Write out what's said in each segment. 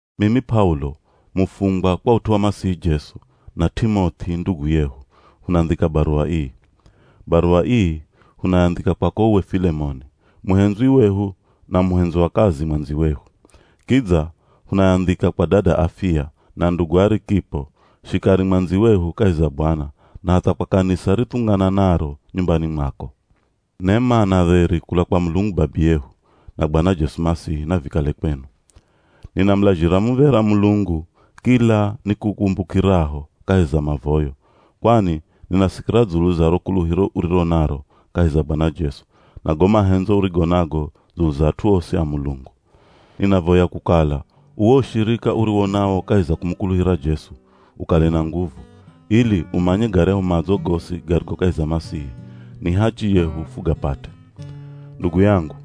Mimi P'aulo, mufungwa kwa ut'u wa Masihi Jesu, na T'imoth'i, ndugu yehu, hunandhika baruwa ii. Baruwa ii hunayandhika kwako uwe Filemoni, muhendzwi wehu na muhendzi wa kazi mwandziwehu. Kidza hunayandhika kwa dada Afiya, na ndugu Arikipo, shikari mwandziwehu kahi za Bwana, na hatha kwa kanisa rithungananaro nyumbani mwako. Nema na dheri kula kwa Mulungu Babiyehu, na Bwana Jesu Masihi, navikale kwenu. Ninamulazhira muv̱era Mulungu kila nikukumbukiraho kahi za mavoyo, kwani ninasikira dzulu za ro kuluhiro uriro naro kahi za Bwana Jesu, na go mahendzo urigo nago dzulu za at'u osi a Mulungu. Ninavoya kukala uwo ushirika uriwo nawo kahi za kumukuluhira Jesu, ukale na nguvu, ili umanye garyahu madzo gosi garigo kahi za Masihi, ni hachi yehu fugapate. Ndugu yangu,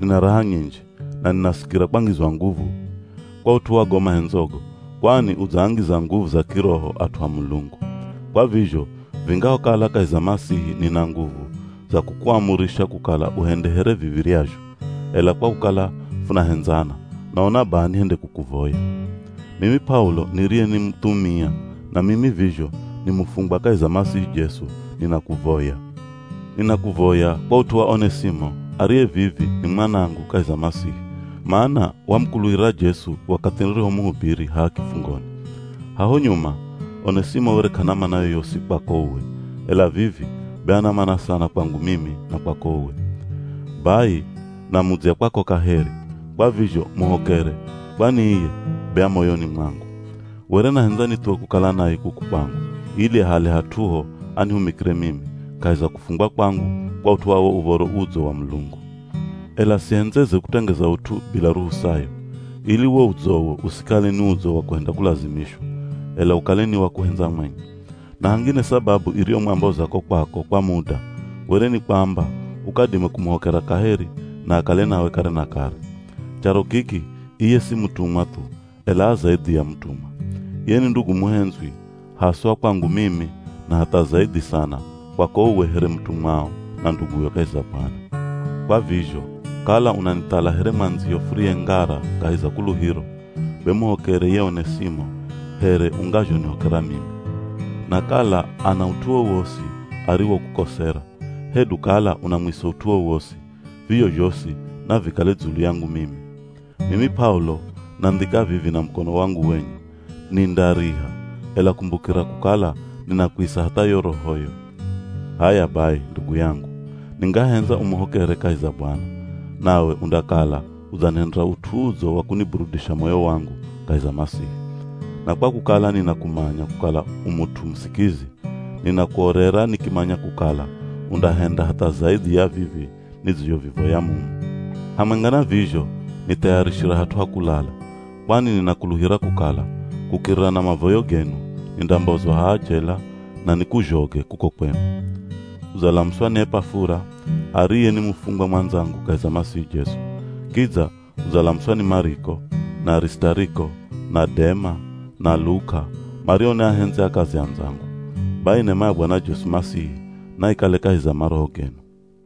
nina raha nyinji, na ninasikira kwangizwa nguvu kwa ut'u wa go mahendzogo, kwani udzaangiza nguvu za kiroho at'u a Mulungu. Kwa vizho, vingahokala kahi za Masihi nina nguvu za kukuamurisha kukala uhende here viv̱iryazho, ela kwa kukala funahendzana, naona baha nihende kukuvoya. Mimi P'aulo niriye ni muthumia, na mimi vizho ni mufungwa kahi za Masihi Jesu ninakuvoya. Ninakuvoya kwa ut'u wa Onesimo ariye vivi ni mwanangu kahi za Masihi, mana wamukuluhira Jesu wakathi nirihomuhubiri haha kifungoni. Haho nyuma, Onesimo were k'ana mana yoyosi kwako uwe, ela vivi be ana mana sana kwangu mimi na kwako uwe. Bai namudzya kwako kaheri, kwa vizho muhokere kwani iye be a moyoni mwangu. Were nahendza nithuwe kukala naye kuku kwangu ili ahale hat'uho anihumikire mimi kahi za kufungwa kwangu kwa ut'u wa Uv̱oro Udzo wa Mulungu. Ela sihendzeze kutengeza ut'u bila ruhusayo, ili wo udzowo usikale ni udzo wa kuhenda kulazimishwa, ela ukale ni wa kuhendza mwenye. Na hangine sababu iriyomwamboza ko kwako kwa muda, were ni kwamba ukadime kumuhokera kaheri na akale nawe kare na kare. Charo kiki iye si mutumwa thu, ela a zaidhi ya mutumwa. Iye ni ndugu muhendzwi haswa kwangu mimi na hatha zaidhi sana kwako uwe here mutumwao na nduguyo kahi za Bwana. Kwa vizho kala unanithala here mwandziyo furiye ngara kahi za kuluhiro, be muhokere ye Onesimo here ungazhonihokera mimi. Na kala ana ut'u wowosi ariwokukosera, hedu kala unamwisa ut'u wowosi, vizho zhosi navikale dzulu yangu mimi. Mimi P'aulo nandhika vivi na mukono wangu wenye, nindariha, ela kumbukira kukala ninakwisa hatha yo rohoyo. H'aya bai, ndugu yangu, ningahendza umuhokere kahi za Bwana, nawe undakala udzanihendera ut'u udzo wa kuniburudisha moyo wangu kahi za Masihi. Na kwa kukala ninakumanya kukala u mut'u musikizi, ninakuorera nikimanya kukala undahenda hatha zaidhi ya vivi nidzizhovivoya mumu. Hamwenga na vizho nithayarishira hat'u ha kulala, kwani ninakuluhira kukala kukirira na mavoyo genu, nindambozwa haha jela na nikuzhoge kuko kwenu. Udzalamuswa ni Epafura, ariye ni mufungwa mwandzangu kahi za Masihi Jesu. Kidza udzalamuswa ni Mariko, na Arisitariko, na Dema, na Luka, mario ni ahendzi a kazi andzangu. Bai nema ya Bwana Jesu Masihi naikale kahi za maroho genu.